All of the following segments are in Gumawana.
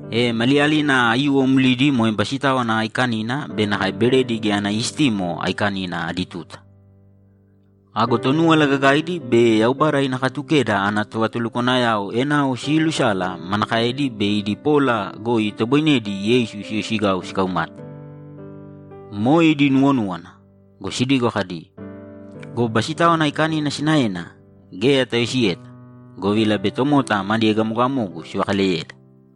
E maliyalina aiyuwo mlidi moe Basitáwana Aikanina be nakae Beredi Geya Ana Istimo Aikanina adi tuta. Ago Tonúwala Gagaidi be Yaubada ina Katukeda ana tovatulukwanayao enao siilusala manakaedi bei idi pola goi itoboinedi Yeisu siyoisigau sikaumate. Moe idi nuwonúwana go, sidigo kadi, ‘Go Basitáwana Aikanina sinaena geya tayoisiyeta, govila bei tomota madi egamogamogu sivakaleyeda.’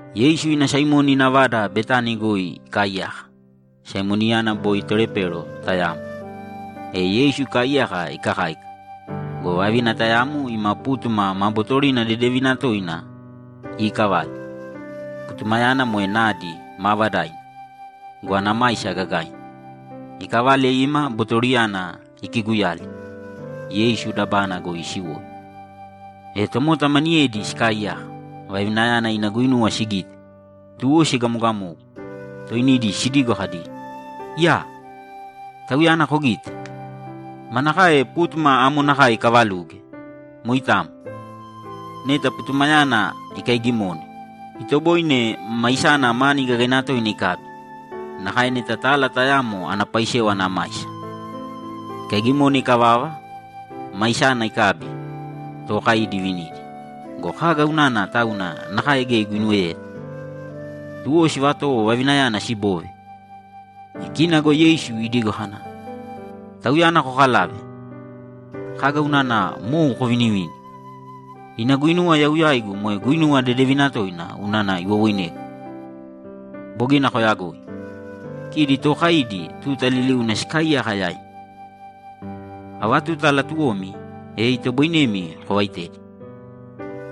Yeisu ina Saimoni ina vada Betani goi ikaaiyaka. Saimoniyana boi tolepero tayamo. E Yeisu ikaaiyaka ikakáika go, vavina tayamo ima pútuma ma bootorina dedevina toina iikavale. Putumayana moe nadi maavadaina go, ana maisa gagaina. Ikavale ima botoriyana ikiguyali, Yeisu dabana goi isiwoi. E tomota maniyedi sikaaiyaka, vavinayana ina guinuwa sigite, tuwo siegamogamogu, toinidi sidigo kadi, ‘Iyaa! Tauyana kogite? Manakae pútuma amo nakae ikavavaluge! Moitamo. Neta putumayana ikaigimone, itoboine maisana mani gagaina toina ikabi; nakae neta tala tayamo ana paisewa ana maisa. Ikaigimone ikavava, maisana ikabi, tookaidi ivinidi. Go kaga unana tauna nakae geya iguinuweyeta?’ Tuwo sivatowo vavinayana siboove. E kina go Yeisu idigo kana, ‘Tauyana kokalāve. Kaga unana mou kovinivini? Ina guinuwa yau yaigu moe guinuwa dedevina toina unana iwowoinegu. Bogina koyagoi. Kidi tookaidi tuta liliuna sikaaiyaka yaimi. Ava tuta latuwomi, e itoboinemi kovaitedi.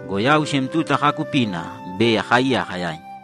Go yau sem tuta kaakupina bei akaaiyaka yaimi.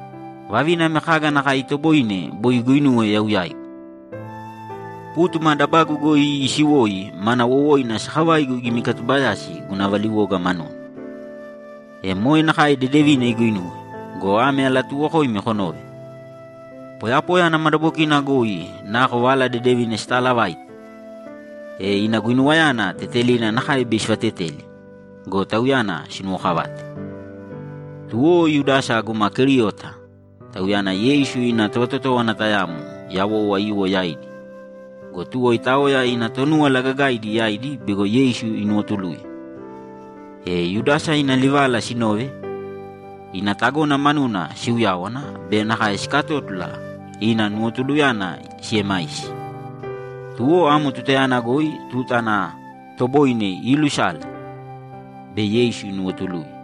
Vavina ame kaga nakae itoboine bogina iguinuwe yau yaigu. Pútuma dabagu goi isiwoi mana wowoina sakavaigu igimikatubayasi guna valiwoga manuna. E moe nakae dedevina iguinuwe go, ame alatuuwokoimi konōve: Poyapoya ana madabokina goi nako Vala Dedevina sitaalavaite, e ina guinuwayana tetelina nakae bei sivateteli go, tauyana sinuwokavate.’ Tuwo Yudasa guma Keriota, tauyana Yeisu ina tovatotówana tayamo yawou aiyuwo yaidi go, tuwo itaoya ina Tonúwala Gagaidi yaidi bego Yeisu inuwotuluye. E Yudasa ina livala sinove, ina tagona manuna siuyáwana be nakae sikatótula ina nuwotuluyana siemaisi. Tuwo amo tutayana goi tuta ana toboine iilusale bei Yeisu inuwotuluye.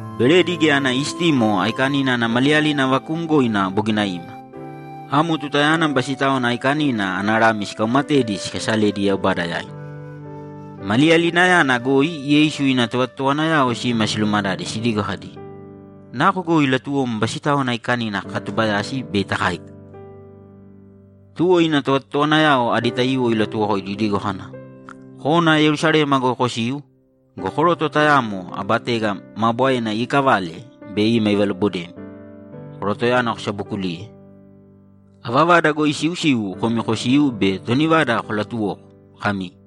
Beredi Geya Ana Istimo Aikanina ana maliyalina vakuumgoina bogina ima. Amo tutayana Basitáwana Aikanina ana lami sikaumatedi sikasaledi Yaubada yaina. Maliyalinayana goi Yeisu ina tovatotowanayao sima silumadade sidigo kadi, ‘Nako goi latuwom Basitáwana Aikanina kakatubayasi bei takáika?’ Tuwo ina tovatotowanayao adi taiyuwo ilatuwokoidi idigo kana, ‘Kōna Yerusalema goi kosīu go, koroto tayamo aba tega maa bwaena iikavale bei ima ivalobodemi. Korotoyana kosabokulīye. Ava vada goi isiusiu komi kosīu be toni vada kolatuwōko kami,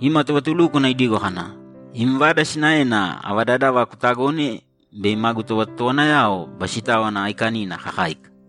“Ima tovatulúkwana idigo kana, ‘Im vada sinaena ava dadava kutagone bei magu tovatotowanayao Basitáwana Aikanina kakáika?’”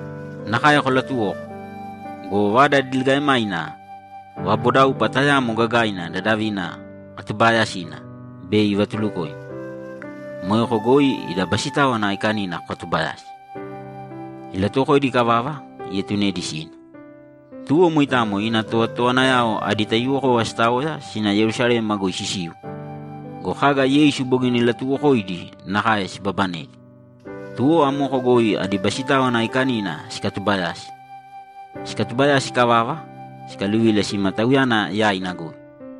Nakae kolatuwōko go, vada diligaemaina vabodaupa tayamo gagaina dadavina katubaayasina bei ivatulukoimi. Moeko goi ida Basitáwana Aikanina kokatubayāsi.’ Ilatuwokoidi ikavava, ietunedi sina. Tuwo moitamo ina tovatotowanayao adi taiyuwokova sitaoya sina Yerusalema goi sisiu go, kaga Yeisu bogina ilatuuwokoidi nakae sibabanedi. Tuwo amoko goi adi Basitáwana Aikanina sikatubayasi. Sikatubayasi ikavava, sikaluvila sima Tauyana yaina goi.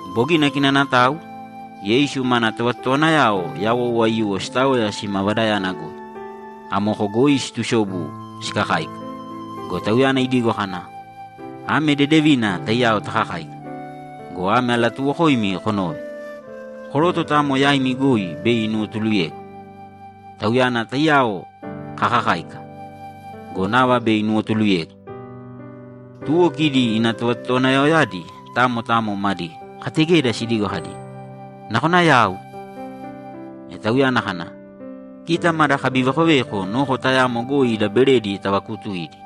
Bogina kinanatau, Yeisu mana tovatotowanayao yawou aiyuwo sitaoya sima vadayana goi. Amoko goi situsobu sikakáika go, Tauyana idigo kana, ‘Ame dedevina taiyao takakáika go, ame alatuuwokoimi konōve: Koroto tayamo yaimi goi bei inuwotuluyegu. Tauyana taiyao kakakáika go, nava bei inuwotuluyegu!’ Tuwo kidi ina tovatotowanayaoyadi tamo tamo madi kategeda sidigo kadi, ‘Nakona yau?’ E Tauyana kana, ‘Kita mada kabivekoveko noko tayamo goi ida beredi tavakuutuidi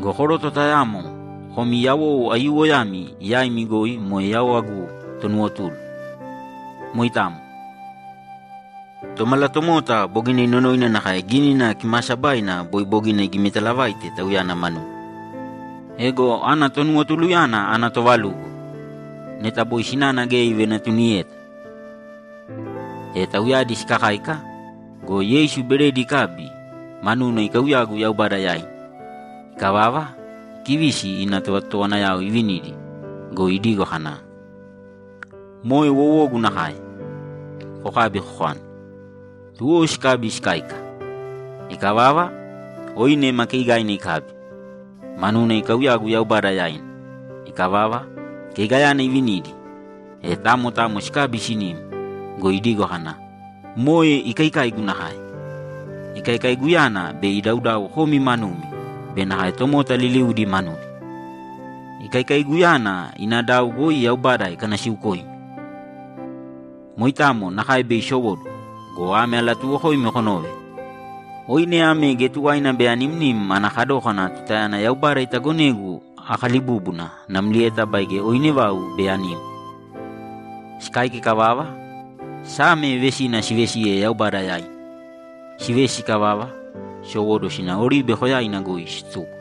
go, koroto tayamo komi yawou aiyuwoyami yaimi goi moe yau agu tonuwotulu. Moitamo. Tomalatomota bogina inonoina nakae Gínina Kimaasabaina boi bogina igimitalavaite Tauyana manuna. Ego ana tonuwotuluyana ana toovalugo! Neta boi sinana geya ivenatuniyeta!’ E tauyadi sikakáika go, Yeisu beredi ikabi, manuna ikauyagu Yaubada yaina. Ikavava, ikivisi ina tovatotowanayao ivinidi go, idigo kana, ‘Moe wowogu nakae. Kokābi kokāni.’ Tuwo sikabi sikáika. Ikavava, oine ma keeigaina ikabi, manuna ikauyagu Yaubada yaina. Ikavava, keigayana ivinidi, e tamo tamo sikabi sinim go, idigo kana, ‘Moe ikaikaigu nakae. Ikaikaiguyana bei idaudau komi manumi be nakae tomota liliudi manudi. Ikaikaiguyana ina dau goi Yaubada ikanasiukoimi. Moitamo nakae bei isowóduwo go, ame alatuuwokoimi konōve: Oine ame geya tuwaina bei animnim ana kadókana tutayana Yaubada itagonegu akalibúbuna namlieta baige oine vau bei anim.’ Sikáika ikavava, Same vesina sivesiye Yaubada yaina. Sivesi ikavava, sisowóduwo sina Oribe Koyaina goi situko.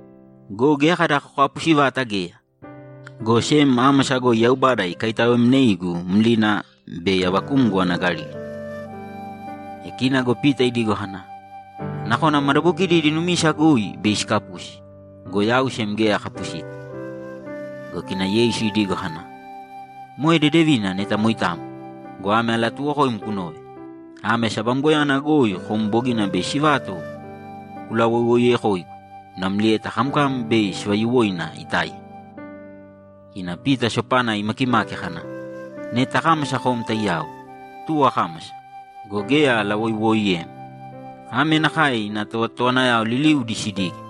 Go geya kada kokapusi vata geya, go sem ámasa goi Yaubada ikaitaoemneigu mlina bei avakumgo ana Galili.’ E kina go Pita idigo kana, ‘Nakona madabokidi idi numisa goi bei sikapusi, go yau sem geya akapusita.’ Go kina Yeisu idigo kana, ‘Moe dedevina neta moitamo go, ame alatuuwokoim kunōve: Ame sabamgoyana goi kom bogina bei sivato kulawoiwoiyekoigu namlieta kamkam bei sivayuwoina itáiya.’ Kina Pita sopana imakimaki kana, ‘Neta akámasa kom taiyao, tuwo akámasa go, geya alawoiwooiyem.’ Ame nakae ina tovatotowanayao liliudi sidige.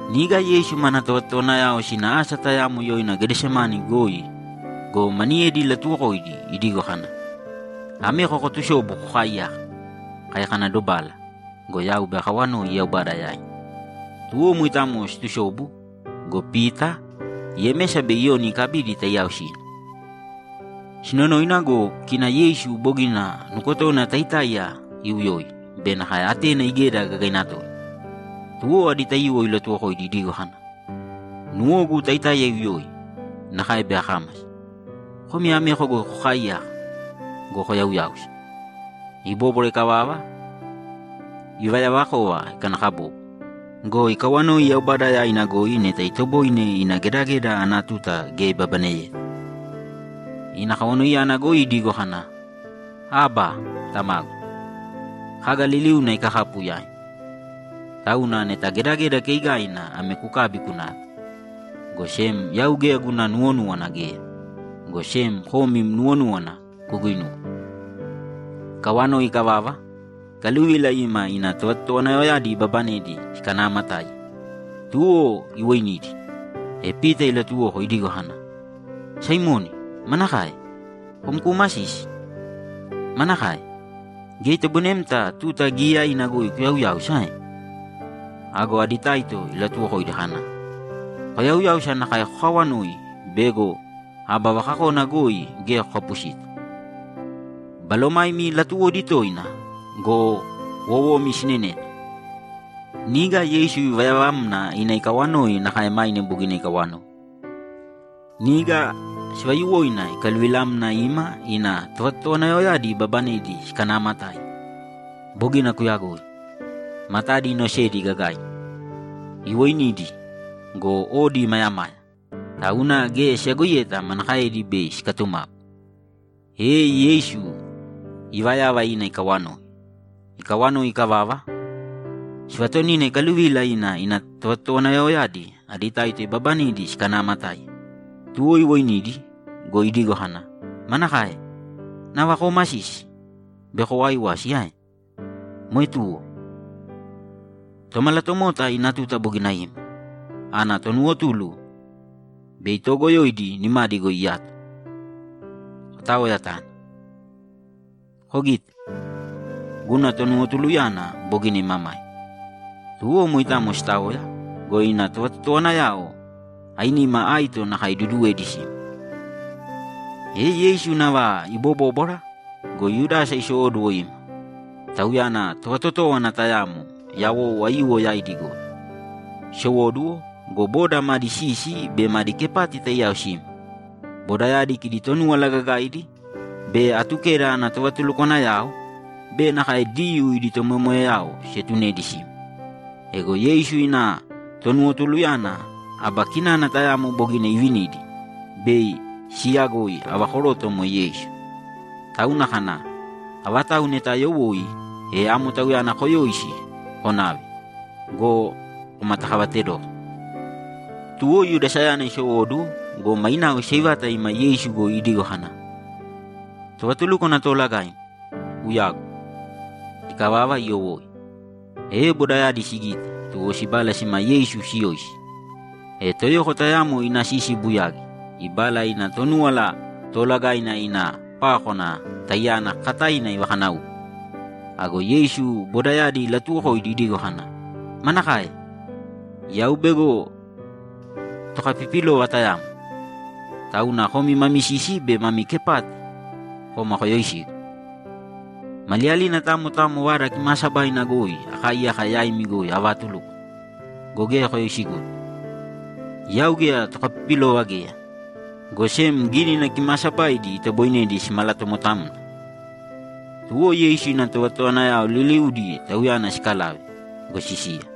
Niga Yeisu mana tovatotowanayao sina asa tayamo yoina Gedesemane goi go, maniyedi ilatuwokoidi idigo kana, ‘Ameko kotusōbu kokaaiyāka. Kai kana dobala go, yau bei akawanoi Yaubada yaina.’ Tuwo moitamo situsobu go, Pita, Yemesa be Iyoni ikabidi taiyao sina. Sinonoina go, kina Yeisu bogina nukotona taitáiya iuyoi be nakae atena igeda gagaina toina. Tuwo adi taito ilatuwokoidi idigo kana, ‘Nuwogu taitáiya iuyoi, nakae bei akámasa. Komi ameko goi kokaaiyāka go, koyauyāusa.’ Ibóbwara ikavava, ivayavakova ikanakabobo go, ikawanoi Yaubada yaina goi neta itoboine ina gedageda ana tuta geya ibabaneyeta. Ina kawanoiyana goi idigo kana, ‘Abba, Tamagu, kaga liliuna ikakapu yaim. Tauna neta gedageda keigaina ame kukābi kunāve. Go sem yau geya guna nuwonúwana geya, go sem kom im nuwonúwana kuguinūwe.’ Ikawanoi ikavava, ikaluvila ima ina tovatotowanayaoyadi ibabanedi sikanaamatáiya, tuwo iwoinidi, e Pita ilatuwoko idigo kana, ‘Saimoni, manakae? Kom kuumasisi? Manakae? Geya itoboinemta tuta giiyaina goi kuyauyáusa ae?’ Ago adi taito ilatuwokoidi kana, ‘Koyauyāusa nakae kokaawanōi bego aba vakakona goi geya kokapusita. Balomaimi latuwodi toina go, wowomi sineneta.’ Niga Yeisu ivayavamna ina ikawanoi nakae maine bogina ikawanoi. Niga sivayuwoina ikaluvilamna ima ina tovatotowanayaoyadi ibabanedi sikanaamatáiya. Bogina kuyagoi. Matadi inosedi gagaina. Iwoinidi go, odi imayamaya, tauna geya siyagoiyeta manakaedi bei sikatumapu. E Yeisu ivayava ina ikawanoi. Ikawanoi ikavava, sivatonina ikaluvila ina ina tovatotowanayaoyadi adi taito ibabanedi sikanaamatáiya. Tuwo iwoinidi go, idigo kana, ‘Manakae? Nava koomasisi be kowaaiwasi ae? Moe tuwo. Tomalatomota ina tuta bogina ima. Ana tonuwotulu bei toogoyoidi nimadi goi iyato. Kotāoya tāna. Kogīte; guna tonuwotuluyana bogina imamaima.’ Tuwo moitamo sitaoya go, ina tovatotowanayao ainima aito nakae iduduwedi sima. E Yeisu nava ibobóbwara go, Yudasa isowóduwo ima. Tauyana tovatotówana tayamo yawou aiyuwo yaidi goi. Isowóduwo go, boda madi sisi be madi kepati taiyao sima. Bodayadi kidi Tonúwala Gagaidi be Atukeda ana tovatulukwanayao be nakae Diyuu idi tomoyamoyayao sietunedi sima. Ego Yeisu ina tonuwotuluyana aba kinana tayamo bogina ivinidi bei siiyagoi ava koroto moe Yeisu, tauna kana, ‘Avatau neta ayowoi, e amo Tauyana koyōisi konāve go, komatakavatedōko.’ Tuwo Yudasayana isowóduwo go, mainao iseivata ima Yeisu goi idigo kana, ‘Tovatulúkwana Toolagaim, uyagu!’ Ikavava, iyowoi. E bodayadi sigite, tuwo sibala sima Yeisu siyoisi. E toyoko tayamo ina sisi ibuyagi, ibala ina Tonúwala Toolagaina ina pákwana taiyana kakataina ivakanáupe. Ago Yeisu bodayadi ilatuwokoidi idigo kana, ‘Manakae? Yau bego tokapipilova tayamo, tauna komi mami sisi be mami kepati koma koyoisigu? Maliyalina tamo tamo Vada Kimaasabaina goi akaaiyaka yaimi goi avaatulúkwana go, geya koyoisiguta. Yau geya tokapipilova geya, go sem Gínina Kimaasabaidi itoboinedi simalatomotamna.’ Tuwo Yeisu ina tovatotowanayao liliudi Tauyana sikalave go, sisiya.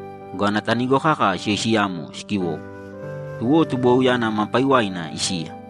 go, ana tanigo kaka siyoisiyamo sikiwowo. Tuwo tubuwauyana ma paiwaina isiya.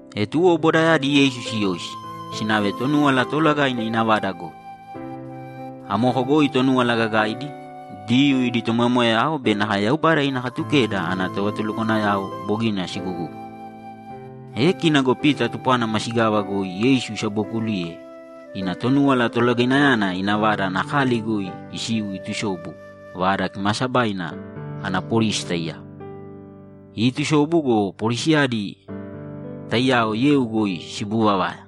E tuwo bodayadi Yeisu siyoisi, sinave Tonúwala Toolagaina ina vada goi. Amoko goi Tonúwala Gagaidi, Diyuu idi tomoyamoyayao be nakae Yaubada ina Katukeda ana tovatulukwanayao bogina sigugúguna. E kina go Pita tupwana masigava goi Yeisu isabookuliye ina Tonúwala Tolagainayana ina vada ana kali goi isiu itusobu Vada Kimaasabaina ana polisi taiyao. Iitusobu go, polisiyadi taiyao yeu goi sibuuvavaya.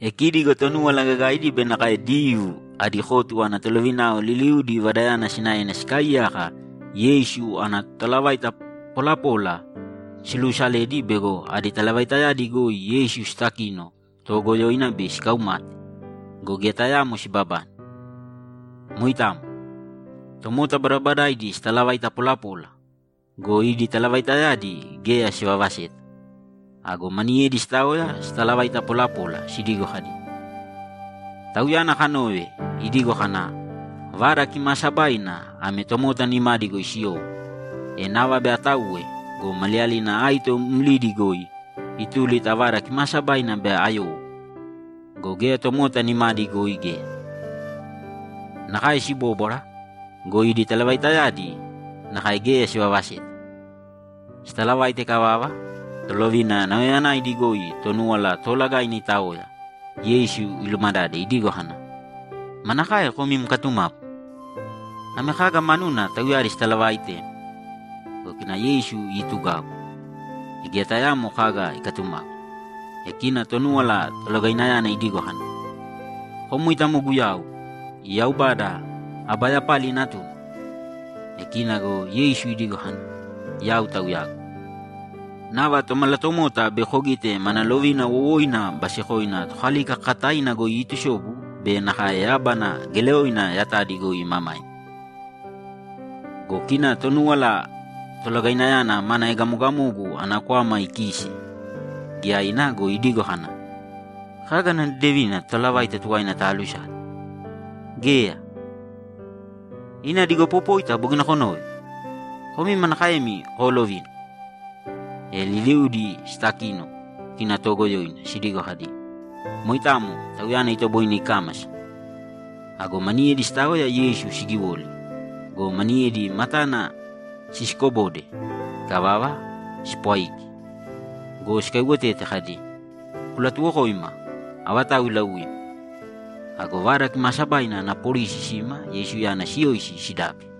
E kidi go Tonúwala Gagaidi be nakae Diyuu adi kotu ana tolovinao liliudi vadayana sinaena sikaaiyaka Yeisu ana totalavaita polapola siluusaledi bego idi talavaitayadi goi Yeisu sitakino toogoyoina bei sikaumate go, geya tayamo sibabane. Moitamo. Tomota badabadaidi sitalavaita polapola go, idi talavaitayadi geya sivavaseta. Ago maniyedi sitaoya sitalavaita polapola, sidigo kadi, ‘Tauyana kanove, idigo kana, “Vada Kimaasabaina ame tomota nimadi goi siyowo, e nava bei atauwe go, maliyalina aito mlidi goi ituli ta Vada Kimaasabaina bei ayowo go, geya tomota nimadi goi geya.”’ Nakae sibóbwara go, idi talavaitayadi nakae geya sivavaseta. Sitalavaita ikavava, tolovina nauyayanaidi goi Tonúwala Toolagaina itaoya, Yeisu ilumadade idigo kana, ‘Manakae kom im katumapu? Ame kaga manuna tauyadi sitalavaaitem?’ Go kina Yeisu iitugau, geya tayaamo kaga ikatumapu. E kina Tonúwala Tolagainayana idigo kana, ‘Kom moitamo Guyau, Yaubada aba yapali Natuna?’ E kina go Yeisu idigo kana, ‘Yau Tauyagu. Nava Tomalatomota bei kogite mana lovina wowoina basekoina Tokalika kakataina goi iitusobu be nakae yábana geleoina yatadi goi imamaima.’ Go kina Tonúwala Tolagainayana mana egamogamogu ana kwama ikiise giyaina go, idigo kana, ‘Kaga ana dedevina totalavaita tuwaina taalusale? Geya! Ina digopopóita bogina konove! Komi manakaemi koolovina?’ E liliudi sitakino kina toogoyoina, sidigo kadi, ‘Moitamo Tauyana itoboine ikámasa!’ Ago maniyedi sitaoya Yeisu sigiwoli go, maniyedi matana sisikobode. Ikavava, sipwaiki go, sikaiwotete kadi, ‘Kulatuwokōima avatau iilauim!’ Ago Vada Kimaasabaina ana polisi sima Yeisuyana siyoisi sidabi.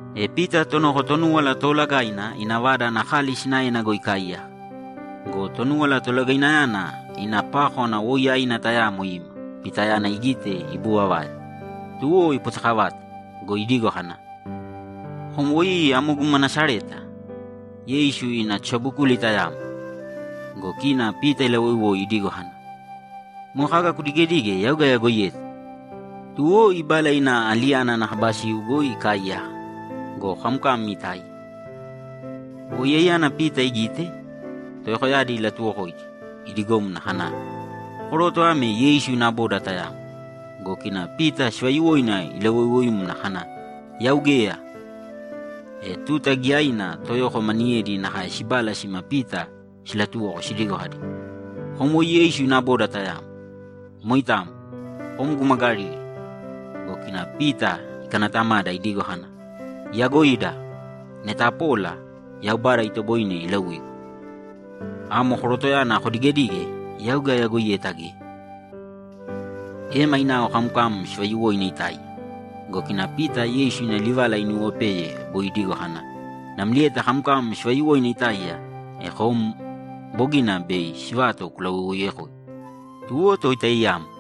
E Pita tonoko Tonúwala Toolagaina ina vada ana kali sinaena goi ikaaiyaka go, Tonúwala Toolagainayana ina pákwana woiyaina tayamo ima Pitayana igite ibuuvavaya. Tuwo ipotekavate go, idigo kana, ‘Kom woi amo guma Nasareta, Yeisu, ina tosabokuli tayamo!’ Go kina Pita ilawoiwoi idigo kana, ‘Moe kaga kudigedige yau geya ayagoiyeta!’ Tuwo, ibala ina aliyana ana kaba siu goi ikaaiyaka go, kamkam itáiya. Woiyaiyana Pita igite, toyokoyadi ilatuwokoidi idigomna kana, ‘Koroto ame Yeisu ina boda tayamo.’ Go kina Pita sivayuwoina ilawoiwoimna kana, ‘Yau geya!’ E tuta giyaina toyoko maniyedi nakae sibala sima Pita silatuwoko sidigo kadi, ‘Kom woi Yeisu ina boda tayamo. Moitamo. Kom guma Galili.’ Go kina Pita ikanatamada idigo kana, ‘Iyagoida! Neta apola, Yaubada itoboine ilauigu. Amo korotoyana kodigedige yau geya ayagoiyeta geya!’ E mainao kamkam sivayuwoina itáiya go, kina Pita Yeisu ina livala inuwopeye boi idigo kana, ‘Namlieta kamkam sivayuwoina itáiya, e kom bogina bei sivato kulawoiwoiyekoigu.’ Tuwo to itaiyamo.